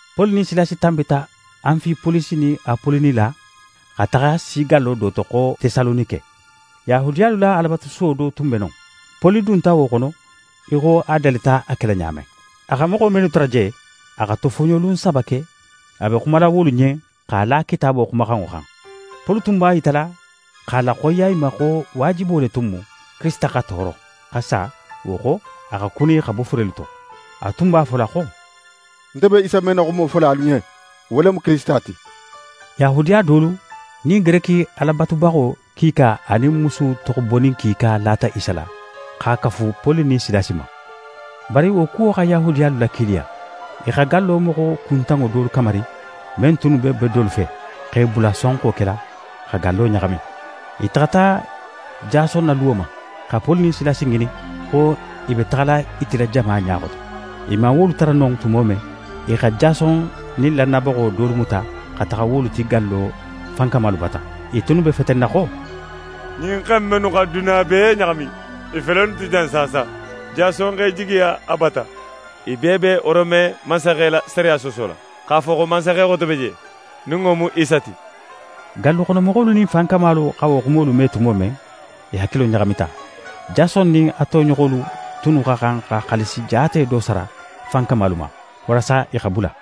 Poli nin Silasi tanbita Anfipolisi nin Apoloni la, xa taxa si gallo do to xo Tesalonike. Yahudiyalu la Alabatusuwo do tun be non. Poli dunta wo xono í xo a dalita a kela ɲa men. A xa moxo mennu tara je, a xa tofoɲolun saba ke a be xumala wolu ɲen x'a la Kitaabo xumaxanŋo xan. Poli tun b'a yitala x'a laxoyiya i ma xo waajibo le tun mu Kirisita xa tooro, xa sa; wo xo, a xa kuni xa bo furelu to. A tun b'a fola xo: «Nte be Isa men na xumo fola alu ɲen, wo le mu Kirisita ti.» Yahudiya dolu, nin Gereki Ala batubaxo kiika anin musu toxobonin kiika lata Isa la, xa kafu Poli nin Silasi ma. Bari wo kuwo xa Yahudiyalu lakiiliya. I xa gallo moxo kuntanŋo dolu kamari men tunnu be bedolu fe, x'e bula sonxo kela, xa gallo ɲaxami. I taxata Jason na luwo ma, xa Poli nin Silasi ŋinin, xo i be taxala i tila jama ɲa xoto. I man wolu tara non tumo men, i xa Jason nin lannayabaxo dolu muta xa taxa wolu ti gallo fankamalu bata. I tunnu be fetenna xo: «Ɲin xe in mennu xa duniya bee ɲaxami, i fele innu ti jan saasa. Jason x'e jigiya a bata. I bee be Rome mansaxe la sariya soosola x'a fo xo mansaxe xote be je, nin wo mu Isa ti.» Galluxonomoxolu nin fankamalu xa wo xumolu me tumo men, i hakilo ɲaxamita. Jason nin a toɲoxolu tunnu xa xan xa xaalisi jaate do sara fankamalu ma, walasa i xa bula.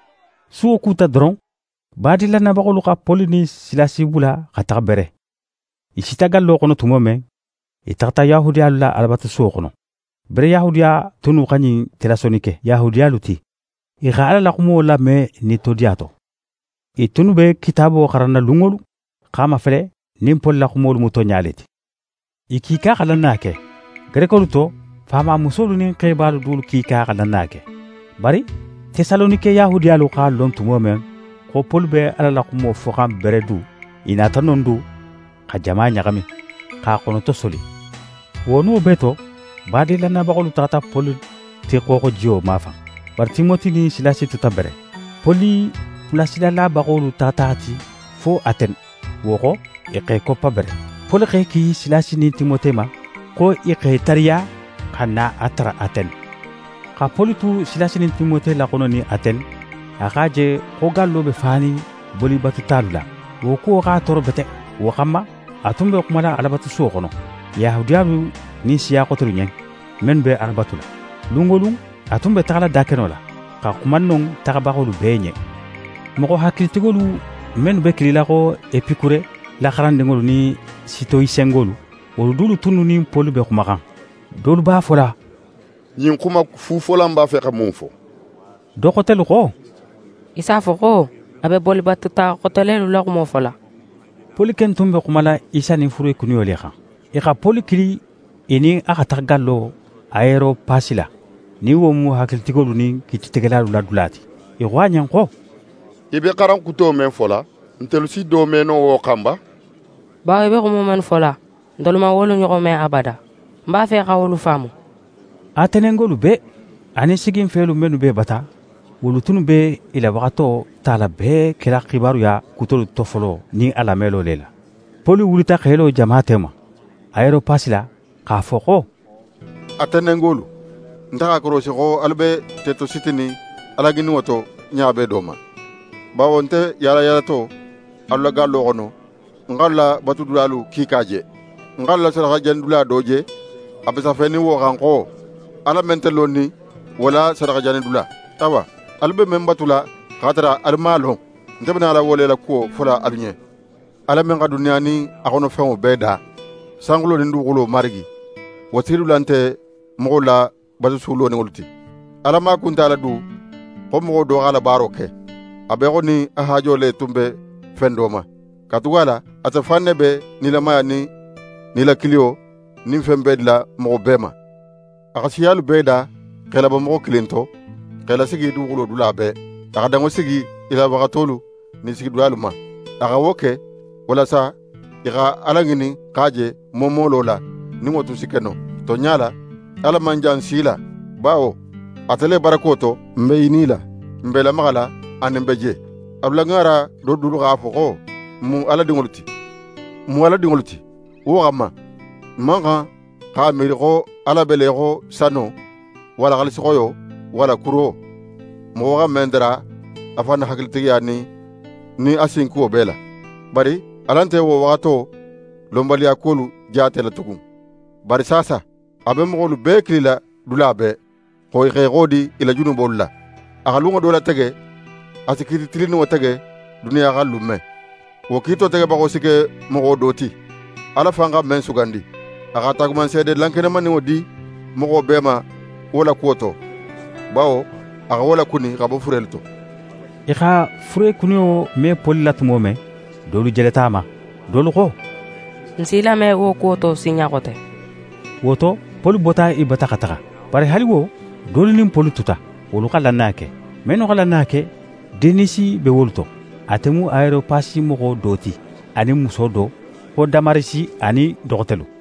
Suwo kuta doron, badin lannayabaxolu xa Poli nin Silasi bula xa taxa Bere. I sita gallo xono tumo men, i taxata Yahudiyalu la Alabatusuwo xono. Bere Yahudiya tunnu xa ɲin Tesalonike Yahudiyalu ti. I xa Ala la xumo lame nitodiya to. I tunnu be Kitaabo xaranna lun wo lun, x'a mafele nin Poli la xumolu mu tonɲa le ti. I kiika xa lannaya ke. Gerekolu to, faamamusolu nin xebalu dulu kiika xa lannaya ke. Bari Tesalonike Yahudiyalu x'a lon tumo men xo Poli be Ala la xumo foxan Bere du, i nata non du xa jama ɲaxami, x'a xonotosoli. Wo no bee to, badin lannayabaxolu taxata Poli ti xooxojiyo mafan, bari Timote nin Silasi tuta Bere. Poli bulasilabaxolu taxata a ti fo Atene. Wo xo, i x'e koppa Bere. Poli x'e ki Silasi nin Timote ma, xo i xa i tariya xa na a tara Atene. Xa Poli tu Silasi nin Timote laxononin Atene, a x'a je xo gallo be fanin bolibatutalu la. Wo kuwo x'a tooro bete. Wo xanma, a tun be xumala Alabatusuwo xono, Yahudiyalu nin siya xotelu ɲen, mennu be Ala batula. Lun wo lun, a tun be taxala dakeno la, xa xuma non taxabaxolu bee ɲen. Moxo hakilitigolu mennu be kilila xo Epikure la xarandinŋolu nin Sitoyisenŋolu, wolu dolu tunnu nin Poli be xumaxan. Dolu b'a fola: «Ɲin xuma fufola in b'a fe xa mun fo?» Do xotelu xo: «I s'a fo xo: A be bolibatuta xote lelu la xumo fola.» Poli ken tun be xumala Isa nin furekuniyo le xan. I xa Poli kili i nin a xa taxa gallo Ayeropasi la, nin wo mu hakilitigolu nin kiititegelalu la dula ti. I xo a ɲen xo: «Í be xaran kuto men fola, ntelu si do me no wo xan ba? Bawo í be xumo mennu fola, ntelu man wolu ɲoxon me abada, n b'a fe xa wolu faamu.» Atenengolu bee, anin siginfelu mennu b'e bata, wolu tunnu be i la waxato tala bee kela xibaruya kutolu tofolo nin i lamelo le la. Poli wulita x'é lo jama tema, Ayeropasi la, x'a fo xo: «Atenengolu, nte x'a korosi xo alu be tetositinin Alaŋininŋo to ɲa bee do ma. Bawo nte yaalayaalato alu la gallo xono, ń xa alu la batulidulalu kiika je. N x'alu la sadaxajanidula do je, a be safenin wo xan xo: “Ala men nte lonnin, wo la sadaxajanidula.” Awa, alu be men batula x'a tara alu man a lon, nte be nala wo le la kuwo fola alu ɲen. Ala men xa duniya nin a xono fenŋo bee da, sanxulo nin duguxulo Marigi, wo sigidula nte moxolu la batusu loninŋolu ti. Ala maaku nte a la du xo moxo x'a la baaro ke, a be í xo nin a haajo le tun be fen do ma; katugala ate fan ne be nilamaya nin nilakiliyo nin fen bee dila moxo bee ma. A xa siyalu bee da x'e labo moxo kilin to, x'e lasigi duguxulo dula bee. A xa danŋo sigi i la waxatolu nin i sigidulalu ma. A xa wo ke walasa i xa Ala ŋinin x'a je moomolo la, nin wo tun si ke no. Tonɲa la, Ala man jan n si la. Bawo: “Ate le barako to, n be i nila, n be i lamaxala anin n be je.” Alu la ŋaara do dulu x'a fo xo: “N mu Ala dinŋolu ti.” N mu Ala dinŋolu ti, wo xanma, n man xan x'a miiri xo Ala be le í xo sano walla xaalisixoyo walla kuro, moxo xa men dara a fan na hakilitigiya nin a sinkuwo bee la. Bari Ala nte wo waxato lonbaliya kuwolu jaatela tugun, bari saasa a be moxolu bee kilila dula bee xo i x'e xodi i la junubolu la. A xa lunŋo do latege a si kiiti tilinninŋo tege duniya xan lun men. Wo kiito tegebaxo si ke moxo do ti, Ala fan xa men sugandi. A xa taagumanseede lankenemaninŋo di moxo bee ma wo la kuwo to; bawo a xa wo lakuni xa bo furelu to.» I xa furekuniyo me Poli la tumo men, dolu jeleta a ma, dolu xo: «N si í lame wo kuwo to sinɲa xote.» Wo to, Poli bota i bata xa taxa. Bari haali wo, dolu nin Poli tuta. Wolu xa lannaya ke. Mennu xa lannaya ke, Denisi be wolu to, ate mu Ayeropasi moxo do ti, anin muso do, xo Damarisi, anin do xotelu.